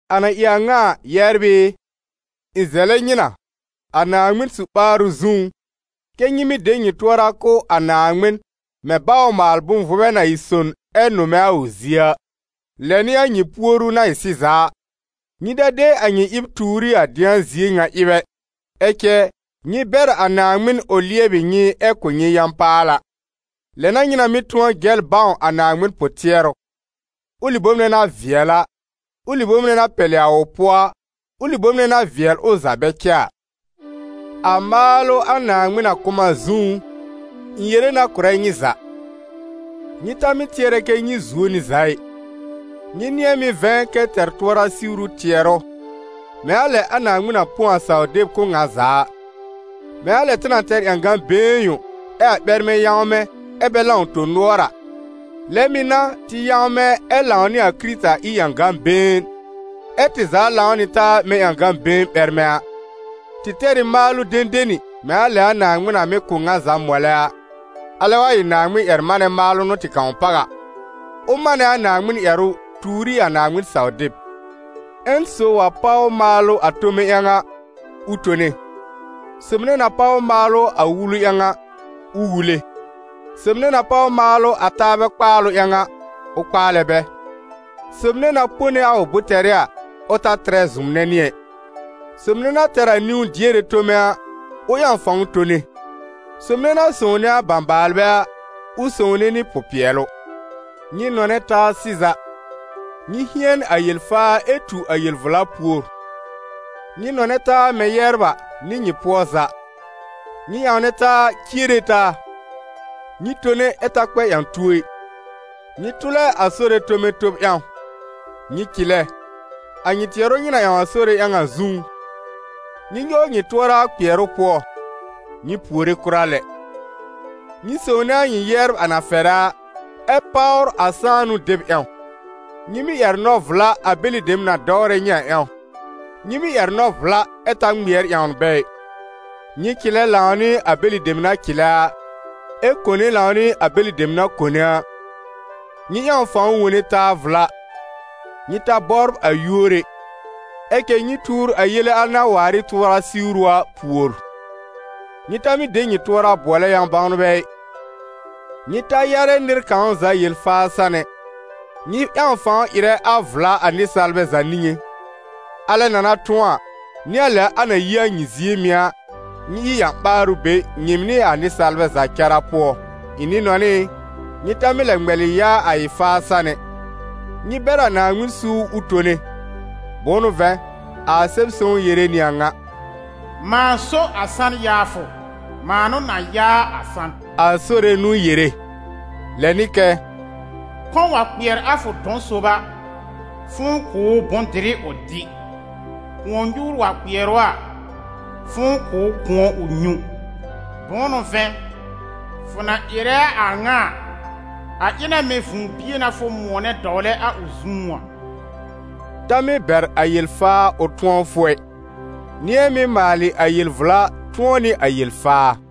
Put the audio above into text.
A na ɩ a ŋa a, yɛbr ɩ, ɩ̃ zɛlɛ nyɩ na, a Naaŋmɩn su-ɓaarʋ zũú, kɛ́ nyɩ mɩ́ de nyɩ tʋɔra kʋ̀ a Naaŋmɩn mɛ̃ baw-maal-bʋ̃-vʋbɛ na ɩ son ɛ nʋmɛ a ʋ zie a: lɛ n'ɩ a nyɩ Naaŋmɩn puoru na ɩ sɩza a. Nyɩ ta de a nyɩ ɩb tuur ɩ a dɩ̃a zie ŋa ɩb ɛ, ɛ cɛ nyɩ bɛr a Naaŋmɩn ʋ lɩɛbɩ nyɩ ɛ kʋ̀ nyɩ yã-paala. Lɛ n'a nyɩ na mɩ́ tʋ̃ɔ jɛl bãw a Naaŋmɩn pʋ-tɩɛrʋ: ʋlɩ bom nɛ na vɩɛl a, ʋlɩ bom nɛ na pɛlɩ a ʋ pʋɔ a, ʋlɩ bom nɛ na vɩɛl ʋ za bɛ cɛ a. A maalʋ a Naaŋmɩn na kʋ̀ m a zũú, ɩ̃ yere na kʋ̀rɛ nyɩ za: nyɩ ta mɩ́ tɩɛrɛ kɛ́ nyɩ zuo nɩ za ɩ, nyɩ nɩ̃ɛ mɩ́ vɛ̃ kɛ tɛr tʋɔra siwru tɩɛrʋ, mɛ̃ a lɛ a Naaŋmɩn na põ a saw-deb kʋ̀ ŋa za a. Mɛ̃ a lɛ tɩ na tɛr ƴãgã-been yõ, ɛ a ɓɛrmɛ yãwmɛ ɛ bɛ lãw tõ-nʋɔr a, lɛ mɩ̀ n'a, tɩ yãwmɛ ɛ lãw nɩ a Kɩrɩta ɩ ƴãgã-been, ɛ́ tɩ za lãw nɩ taa mɛ̃ ƴãgã-been ɓɛrmɛ a. Tɩ tɛr ɩ maalʋ dẽdeni, mɛ̃ a lɛ a Naaŋmɩn na mɩ́ kʋ̀ ŋa za mɔlɛ a. Alɛ wa ɩ Naaŋmɩn-ƴɛr-manɛ maalʋ n'ʋ tɩ kãw páw a, ʋ manɛ a Naaŋmɩn ƴɛrʋ tuur ɩ a Naaŋmɩn-saw-deb. Ƴẽn sob wa páw maalʋ a tome ƴãw a, ʋ tone. Sob nɛ na páw maalʋ a wulu ƴãw a, ʋ wule. Sob nɛ na páw maalʋ a taabɛ kpaalʋ ƴãw a, ʋ kpaalɛ bɛ. Sob nɛ na pone a ʋ bʋ̃-tɛrɩ a, ʋ ta tɩrɛ zʋmnɛ nɩ ɛ. Sob nɛ na tɛr a niwn-diere tome a, ʋ ƴãw fãw tone. Sob nɛ na sõwne a bãbaalbɛ a, ʋ sõwne nɩ pʋ-pɩɛlʋ. Nyɩ nɔnɛ taa sɩza. Nyɩ hɩɛn a yel-faa ɛ tu a yel-vla pùor. Nyɩ nɔnɛ taa mɛ̃ yɛbr a, nɩ nyɩ pʋɔ za; nyɩ ƴãwnɛ taa ciere taa. Nyɩ tone ɛ ta kpɛ ƴã-tuo ɩ. Nyɩ tʋlɛ a Sore tome tob ƴãw. Nyɩ cɩlɛ, a nyɩ tɩɛrʋ nyɩ na ƴãw a Sore ƴãw a zũú; nyɩ nyɔw nyɩ tʋɔra a kpɩɛrʋ pʋɔ; nyɩ puore kʋra lɛ. Nyɩ sõwne a nyɩ yɛbr a na fɛrɛ a, ɛ páwr a sãanʋ deb ƴãw. Nyɩ mɩ́ ƴɛr nɔ-vla a bɛlɩ dem na dɔwrɛ nyɩ a ƴãw, nyɩ mɩ́ ƴɛr nɔ-vla ɛ ta ŋmɩɛr ƴãwn bɛ ɩ. Nyɩ cɩlɛ lãw nɩ a bɛlɩ dem na cɩlɛ a, ɛ kone lãw nɩ a bɛlɩ dem na kone a. Nyɩ ƴãw fãw wone taa vla. Nyɩ ta bɔbr a yúor ɛ, ɛ cɛ nyɩ tuur a yele al na waar ɩ tʋɔra siwru a pùor. Nyɩ ta mɩ́ de nyɩ tʋɔra bʋɔlɛ yã-bãwnbɛ ɩ. Nyɩ ta yarɛ nɩr kãw za yel-faa san ɛ. Nyɩ ƴãw fãw ɩrɛ a vla a nɩsaalbɛ za niŋé. Alɛ na na tʋ̃ɔ a, nɩ a lɛ a na yi a nyɩ zie mɩ̀ a, nyɩ ɩ ƴã-ɓaarʋ be nyɩɩm nɩ a nɩsaalbɛ za cara pʋɔ. Ɩ̃ nɩ-nɔnɩ ɩ, nyɩ ta mɩ́ lɛ ŋmɛlɩ yaa a ɩ-faa san ɛ, nyɩ bɛr a Naaŋmɩn suur ʋ tone, bʋ̃ʋ n'ʋ vɛ̃, a Sɛb-sõw yere nɩ a ŋa: «Mãa so a san-yaafʋ, mãa n'ʋ na yaa a san», a Sore n'ʋ yere. Lɛ nɩ kɛ: «Kɔ̃ wa kpɩɛr a fʋ dɔ̃ sob a, fʋ̃ʋ kʋ̀ ʋ bʋ̃-dɩrɩ ʋ dɩ; kʋ̃ɔ-nyuur wa kpɩɛr ʋ a, fʋ̃ʋ kʋ̀ ʋ kʋ̃ɔ ʋ nyũ; bʋ̃ʋ n'ʋ vɛ̃, fʋ na ɩrɛ a a ŋa a, a ɩ na mɛ̃ vũu-bie n'a fʋ mʋ̃ɔnɛ dɔwlɛ a ʋ zũú a.» Ta mɩ́ bɛr a yel-faa ʋ tʋ̃ɔ fʋ ɛ, nɩ̃ɛ mɩ́ maalɩ a yel-vla tʋ̃ɔ nɩ a yel-faa.